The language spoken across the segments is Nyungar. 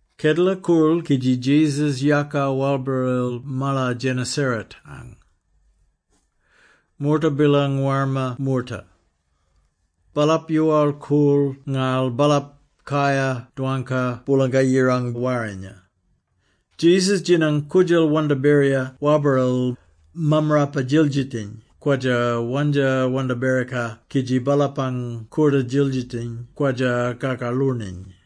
Kedela koorl kidji Jesus yaaka walbaril Malar Gennesaret-ang. Moorta bilang warma moorta. Baalap yoowal-koorl ngarl baalap kayar dwangka Boolanga-Yirang warrinya. Jesus djinang koodjal wandaberira wabaril; mammarapa-djildjitiny kwadja-wandja wandaberika kidji baalapang kooda-djildjitiny kwadja kakaloorniny.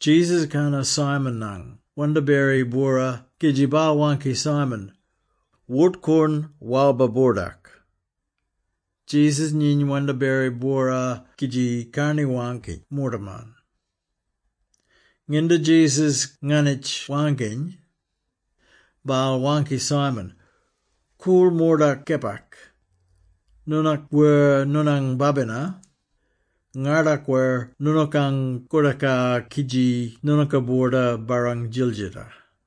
Jesus kana Simon-ang wandaberi-bwora kidji baal waangki Simon, “Wort-koorn walbar-boordak.” Jesus nyiny wandaberi-bwora kidji karni-waangki moortaman. Nginda Jesus nganitj waangkiny, baal waangki Simon, “Koorl mordak kepak. Noonook wer noonang babina, ngardakwir noonookang koodaka kidji noonooka boorda barrang djildjita.”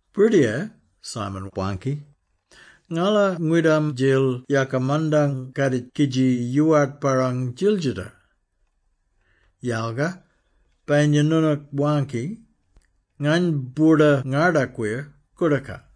“Birdiyar,” Simon waangki. “Ngala ngwidam-djil yaka mandang kadik kidji yoowart barrang djildjita. Yalga, bayinya noonook waangki, ngany boorda-ngardakwir koodaka.”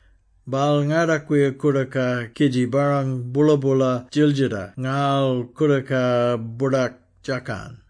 Baal ngardakwir koodaka kidji barrang boola-boola djildjita ngarl koodaka boordak djakan.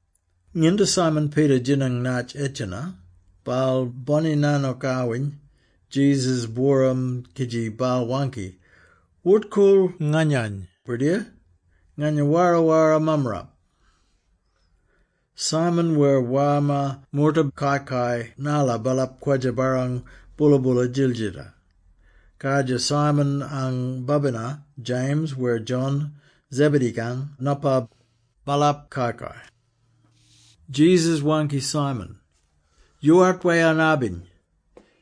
Nginda Simon Peter djinang natj edjena, baal boni-nanookawin Jesus-booram kidji baal waangki, “Wort-koorl nganyany, Birdiyar! Ngany wara-wara mammarap!” Simon wer warma moorta kai-kai narla baalap kwadja barrang boola-boola djildjita. Kardjir, Simon-ang babina, James wer John, Zebedee-kang nopa, baalap kai-kai. Jesus waangki Simon, “Yoowart wayarn-abiny.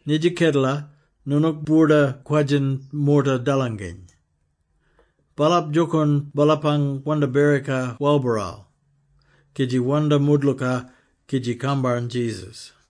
Nidja kedela, noonook boorda kwadjin moorta dalanginy.” Baalap djookoorn baalapang wandaberika walbaral, kidji wandja moodlooka, kidji kambarn Jesus.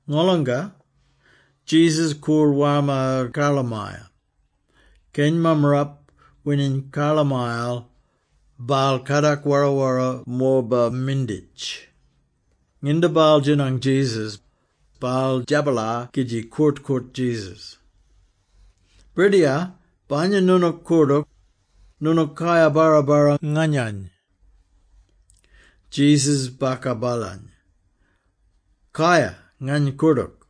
Ngolonga, Jesus koorl warma karlamaya. Keny mammarap wining karlamayal, baal kadak wara-wara morba-minditj. Nginda baal djinang Jesus, baal djabalar kidji koort-koort Jesus, “Birdiyar, bayinya noonook koordook, noonook kayar-barra-barra nganyany!” Jesus baka baalany. “Kaya, ngany koordook!”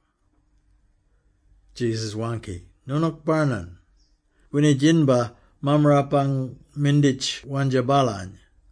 Jesus waangki, “Noonook barnan!” Winidjinbar, mammarapang minditj wandja baalany.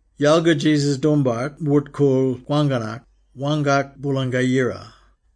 Yalga Jesus doombart wort-koorl kwangkanak, waangkak Boolanga-Yira.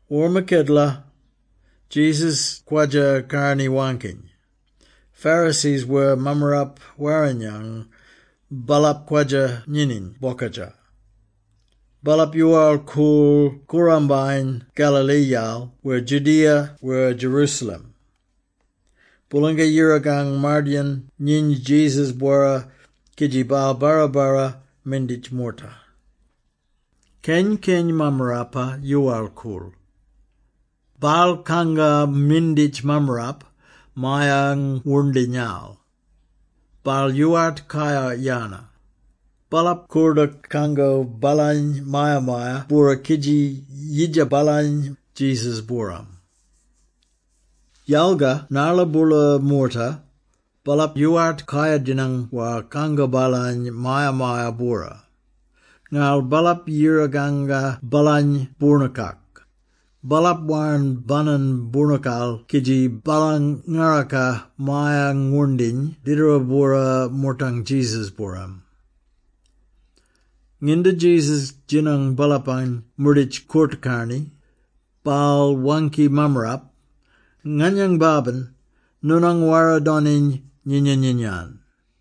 Warma kedela, Jesus kwadja karni-waangkiny. Pharisees wer Mammarapa-Warrinyang, baalap kwadja nyininy bokadja. Baalap yoowal-koorl koorambayen Galilee-yal wer Judea wer Jerusalem. Boolanga-Yirakang mardayin nyiny Jesus-bwora kidji baal barra-barra minditj moorta. Keny-keny mammarapa yoowal-koorl. Baal kanga minditj mammarap maya-ngwoorndinyal. Baal yoowart kayar-yana. Baalap koordook kango baalany maya-maya-bwora kidji yidja baalany Jesus-booram. Yalga narla boola moorta, baalap yoowart kayar-djinang war kango baalany maya-maya-bwora. Ngarl baalap yira-kanga baalany boornookak. Baalap warn banan boornookal kidji baalang ngaraka maya-ngwoorndiny didara-bwora moortang Jesus-booram. Nginda Jesus djinang baalapang moorditj koort-karni, baal waangki mammarap, “Nganyang babin, noonang wara-doniny nyinya-nyinya-yan.”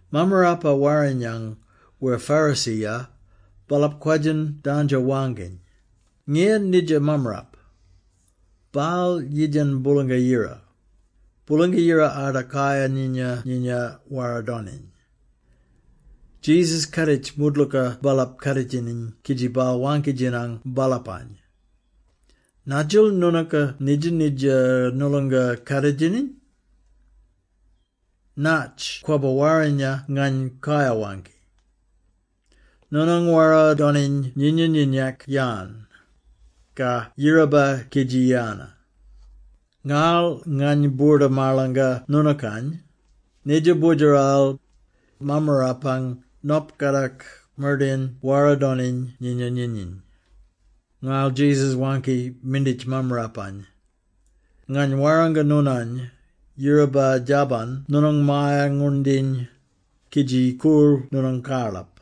Mammarapa-Warrinyang wer Pharisee-ya, baalap kwadjin danjo-waangkiny, “Ngiyan nidja mammarap? Baal yidjan Boolanga-Yira! Boolanga-Yira arda kayar-nyinya-nyinya wara-doniny!” Jesus kaaditj moodlooka baalap kaaditjiny kidji baal waangki-djinang baalapany, “Nadjil noonooka nidja-nidja noolonga kaaditjiny? Natj kwabba warrinya ngany kayar-waangki? ‘Noonang wara-doniny nyinya-nyinak-yan?’ ka ‘Yiraba kidji yana?’ Ngarl ngany boorda-marlanga noonookany, nidja Boodjeral, Mammarapang Nop kadak mardayin wara doniny nyinya-nyinyiny.” Ngarl Jesus waangki minditj mammarapany, “Ngany warranga noonany, yiraba, djabban noonang maya-ngwoorndiny, kidji koorl noonang karlap!”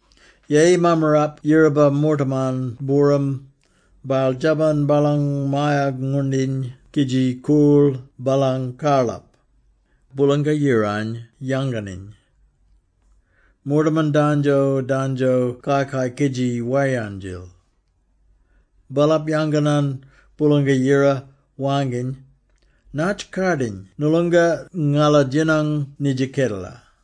Yeyi mammarap yiraba moortaman booram, baal djabban baalang maya-ngwoorndiny kidji koorl baalang karlap, Boolanga-Yirany yanganiny. Moortaman dandjo-dandjo kai-kai kidji wayarn-djil. Baalap yanganan Boolanga-Yira, waangkiny, “Natj kardiny noolonga ngala djinang nidja kedela!”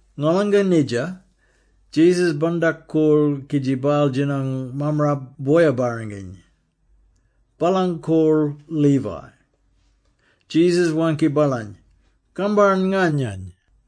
Ngolanga nidja, Jesus bandak-koorl kidji baal djinang mammarap boya-barranginy. Baalang kol Levi. Jesus waangki baalany, “Kambarn nganyany!”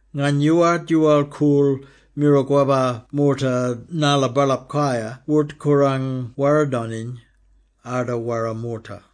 Ngany yoowart yoowal-koorl miro kwabba moorta narla baalap kayar wort-korang wara-doniny, arda wara moorta.”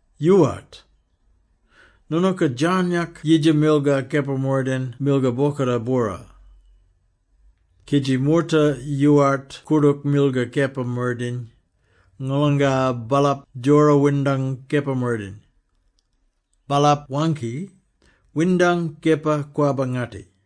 Yoowart! Noonooka djarnyak yidja milgar kepa-mardayin milgar bwokooda bwora! Kidji moorta yoowart koordook milgar kepa-mardayin, ngolanga baalap djora windang kepa-mardayin. Baalap waangki, ‘Windang kepa kwabba-ngatti!’”